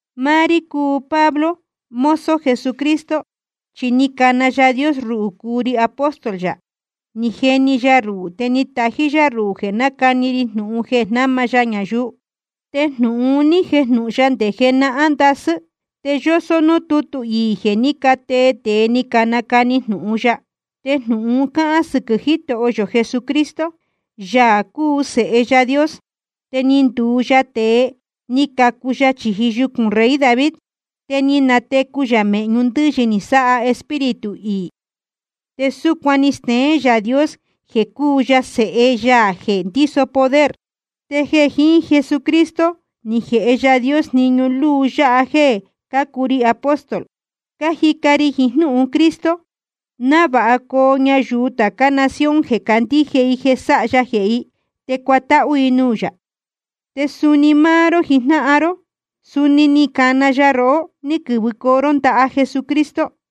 Máá rí cúu Pablo, mozo Jesucristo, chi ni cana Yaā Dios ruhū cúu ri apóstol yā, ni jeni ya ruhū te ni tají yá ruhū jeē nácani ri jnūhun jeē jnáma ya ñayuu. Te jnūhun un ní jejnūhun ya nde jenahán ndasɨ́, te yósó núū tútu iī jeē ní catee tēe ni canacani jnūhun ya. Te jnūhun un cáhán sɨquɨ̄ Jitoho yō Jesucristo, Yaā cúu Sēhe Yaā Dios. Te ni nduu ya tēe, ni cacu ya chīji yucūn rey David. Te ni natecu yā mēhñu ndɨ́yɨ ni sáha Espíritu iī, te súcuan ni steén Yaā Dios jeē cúu ya Sēhe ya jeē ndíso poder. Te jeē jiín Jesucristo ni jēhe Yaā Dios jniñu luu yáha jeē cácuu ri apóstol, cájica ri jiín jnúhun Cristo, návāha coo ñayuu tācá nación jeē candíje i jeē sáha ya jehē i, te cuatáhú i nuū yā. Te suni máá ró jijnáhan ró, suni ni cana ya rohó ní quɨ́vɨcoo ró ndaha Jesucristo.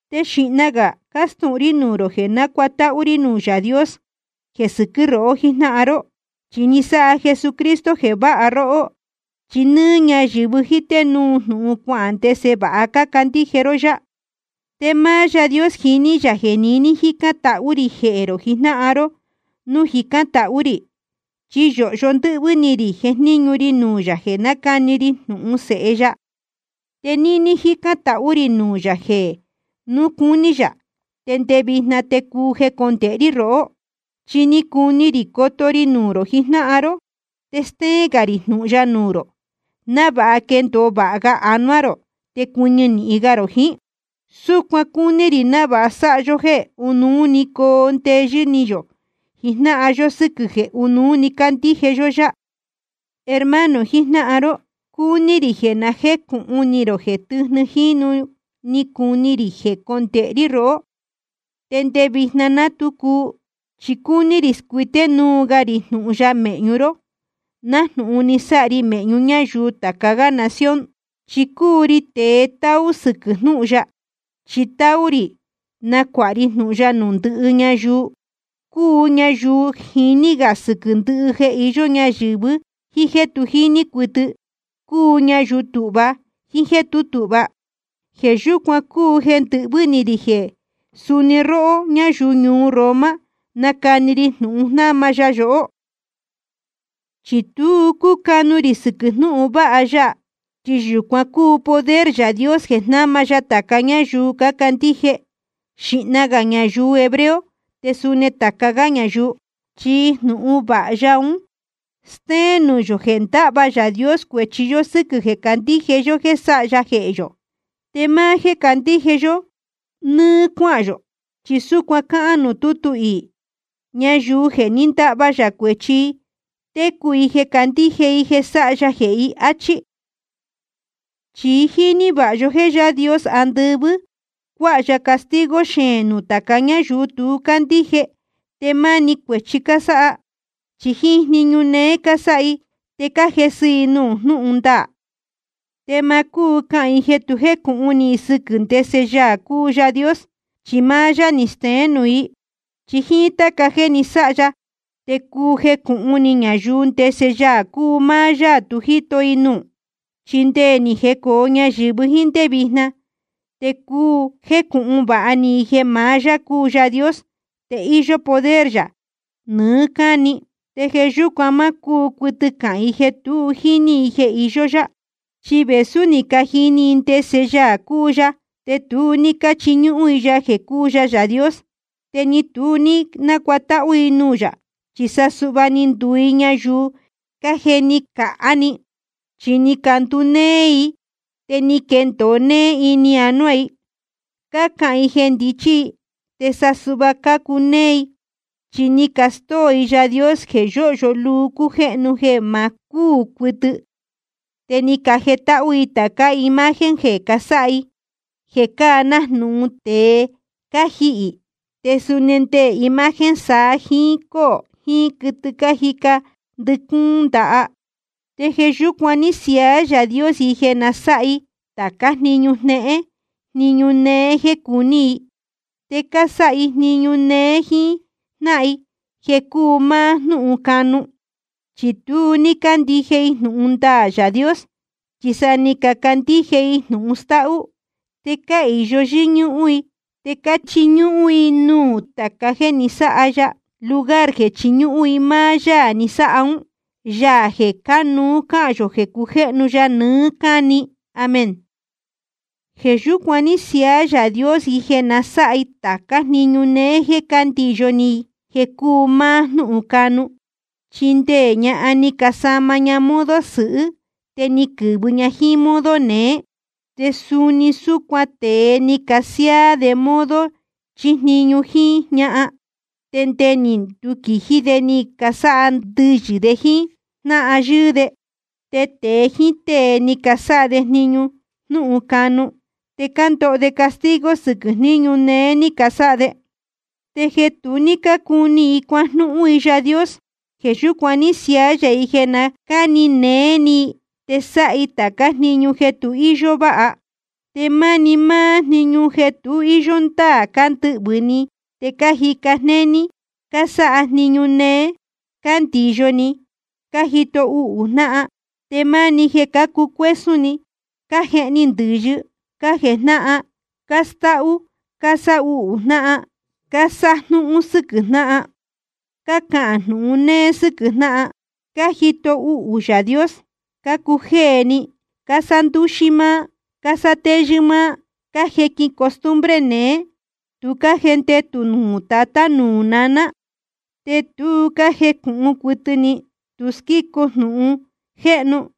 Te xīhna gā cástūhun rí nuū rō jeē nácuatáhú rí nuū Yaā Dios jeē sɨquɨ́ rohó jijnáhan ró, chi ni sáha Jesucristo jeē váha róhó. Chi nɨ́ɨ́ ñáyɨ̄vɨ jíté núu jnūhun cuahān ndese vāha cácandíje ró yá. Te máá Yaā Dios jiní yā jeē niní jícán tahú rī jehē rō jijnáhan ró nuū jicán tahú rī. Chi yōhyo ndɨ́hvɨ́ ni rī jejníñu ri nuū yā jeē nácani ri jnūhun Sēhe ya. Te níní jícán tahú rī nuū yā jeē núu cúní yā te nde vijna te cuu jecondēhe rí rohó. Chi cúu ni rī coto ri nuū rō jijnáhan ró, te stéén gā rī jnūhun ya nuū rō, návāha quendōo vāha ga anuá rō te cuɨñɨ nīhin ga rō jiín. Súcuan cúní rī návāha sáha yó jéē ɨnuú coo ndeyɨ́ ni yō jijnáhan yó sɨquɨ̄ jeē ɨ́nuú cácandíje yó yá. Hermano jijnáhan ró, cúní rī jeē na jécūhun ni rō jeē tɨ́jnɨ jínu ni cuu ni rī jecondēhe rí rohó, te nde vijna ná tu cuu. Chi cúní rī scuité núu ga rī jnūhun ya mēhñu ró, nájnūhun ni sáha ri mēhñu ñáyuu tāca gá nación. Chi cúu ri tēe táú sɨquɨ̄ jnúhun ya, chi táú rī nacuāha ri jnūhun ya nuū ndɨhɨ ñayuu, cúu ñayuu jiní gā sɨquɨ̄ ndɨhɨ jeē iyó ñayɨ̄vɨ jíín jéē tu jíní cuɨtɨ, cúu ñayuu tūhva jíín jéē tú tūhva. Jeē yúcuan cúu jeē ndɨhvɨ́ ni rī jeē suni nuū rohó ñáyuu ñuu Roma nacani ri jnūhun jnáma ya yohó. Chi tu cúcanu rī sɨquɨ̄ jnúhun vāha ya, chi yūcuan cúu poder Yaā Dios jeē jnáma ya tāca ñáyuu cácandíje, xīhna gā ñayuu hebreo te suni tāca gá ñayuu. Chi jnūhun vāha ya un stéén nuū yō jeē ndáhva Yaā Dios cuēchi yó sɨ́quɨ̄ jeē candíje yó jéē sáha ya jehē yō, te máá jéē candíje yó nɨ́ɨ́ cuáhān yō. Chi súcuan cáhán nuū tútu iī: Ñayuu jeē ní ndahva yā cuēchi i, técu i jeē candíje i jeē sáha ya jehē i, áchí. Chi jíní vāha yó jéē Yaā Dios andɨvɨ́, cuāha ya castigo xeēn nuū tāca ñáyuu tu cácandíje te máni cuēchi cásáha. Chi jíín jniñu néé cásáha i te cájesɨ i nuū jnúhun ndaā. Te ma cúu cahān i jeē tu jécūhun ni i sɨquɨ̄ ndese Yaā cúu Yaā Dios, chi máá yá ni steén nuū i. Chi jíín táca jeē ni sáha ya te cúu jécūhun ni ñayuu ndese Yaā cúu máá Yaā tu jíto i nuū. Chi nde ni jecōo ñayɨ̄vɨ jíín ndé vijna te cúu jécūhun vāha ni i jeē maá yá cúu Yaā Dios te íyó poder yā nɨɨ́ cáni. Te jeē yúcuan má cúu cuɨtɨ cahān i jeē tu jíní i jeē iyó yá. Chi vēsú ni cajini i ndese Yaā cúu ya, te tu ní cáchiñúhún i ya jeē cúu ya Yaā Dios, te ni tu ní nácuatáhú i nuū yā. Chi sa suhva ni nduu i ñayuu cájeni cāhá ni, chi ni candunéé íī i, te ni quendōo nee ini anuá i. Cácahān i jeē ndichí i, te sa suhva cácunéé i. Chi ni castóo i Yaā Dios jeē yóhyo luu cújéhnu, jeē ma cúū cuɨtɨ. Te ni cajetáhú i tācá imagen jeē casáha i, jeē cáa nájnūhun tēe cájihī, te suni nde imagen saa jiín cóō jiín quɨtɨ cájica ndɨcúún ndaha. Te jeē yúcuan ní siaá Yaā Dios i jeē na sáha i tācá jniñu jnéhén jniñu néé jéē cuní i. Te cásáha i jniñu néé jíín jnáhan i jeē cúu máá jnúhun canu. Chi tu ní cácandíje i jnūhun ndaā Yaā Dios, chi sa ni cacandíje i jnūhun stáhú. Te cáhīyo yɨ́ñúhún i te cáchiñúhún i nuū tāca jéē ni sáha ya, lugar jeē chiñúhún i máá Yaā ni sáha ún, Yaā jeē cánuú cahān yō jeē cujéhnu ya nɨɨ́ cáni. Amén. Jeē yúcuan ní siaá Yaā Dios i jeē na sáha i tācá jniñu néé jéē cándiyo ni i jeē cúu máá jnúhun canu. Chi nde ñahan ni casama ña modo sɨhɨ́, te ni quɨ̄vɨ ña jíín modo neé. Te suni súcuan tēe ni casiáá de modo chíjniñu jíín ñahan. Te nde ni nduquījí de ni casáha ndɨyɨ̄ de jíín jnáhan yɨ́ɨ́ de, te tēe jíín tée ni casáha de jniñu jnúhun canu. Te cándoho de castigo sɨquɨ̄ jníñu néé ní casáha de. Te jeē tu ní cácuni i cuajnúhún i Yaā Dios, jeē yúcuan ní siaá yā i jeē na cáni néé ni i, te sáha i tācá jniñu jeē tu íyó váha. Te máni máá na jniñu jeē tu íyó ndáā cándɨhvɨ̄ ni, te cájica jnéní, cásáha jniñu néé, cándiyo ni, cájito uhū jnáhan. Te máni jeē cácucuésún ni, cájehni ndɨ̄yɨ, cájejnáhan, cástáhú, cásáhuhū jnáhan, cásájnúhún sɨquɨ̄ jnáhan. Cácahān jnūhun néé sɨ́quɨ̄ jnáhan, cájito uhū Yaā Dios, cácujéē ni, cásándúxí máá, cásátéyɨ́ máá, cájequin costumbre neé, tu cájendetū nuū tatá nuū naná. Te tu cájecūhun cuɨtɨ ni, tu squícu jnūhun jéjnūhun,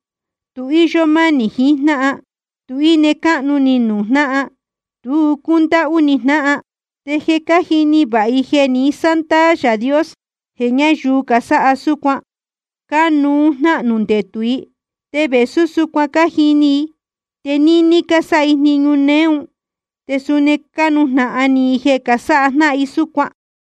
tu íyó mánī jiín jnáhan, tu íne cáhnu ni nuū jnáhan, tu cúndáhú ni jnáhan. Te je cájini vāha i jeē ni sándaā Yaā Dios jeē ñáyuu casáha súcuan, cánuú jnahnū ndetū i. Te vēsú súcuan cájini i, te níní cásáha i jniñu néé un, te suni cánujnahan ni i jeē casáha jnáhan i súcuan.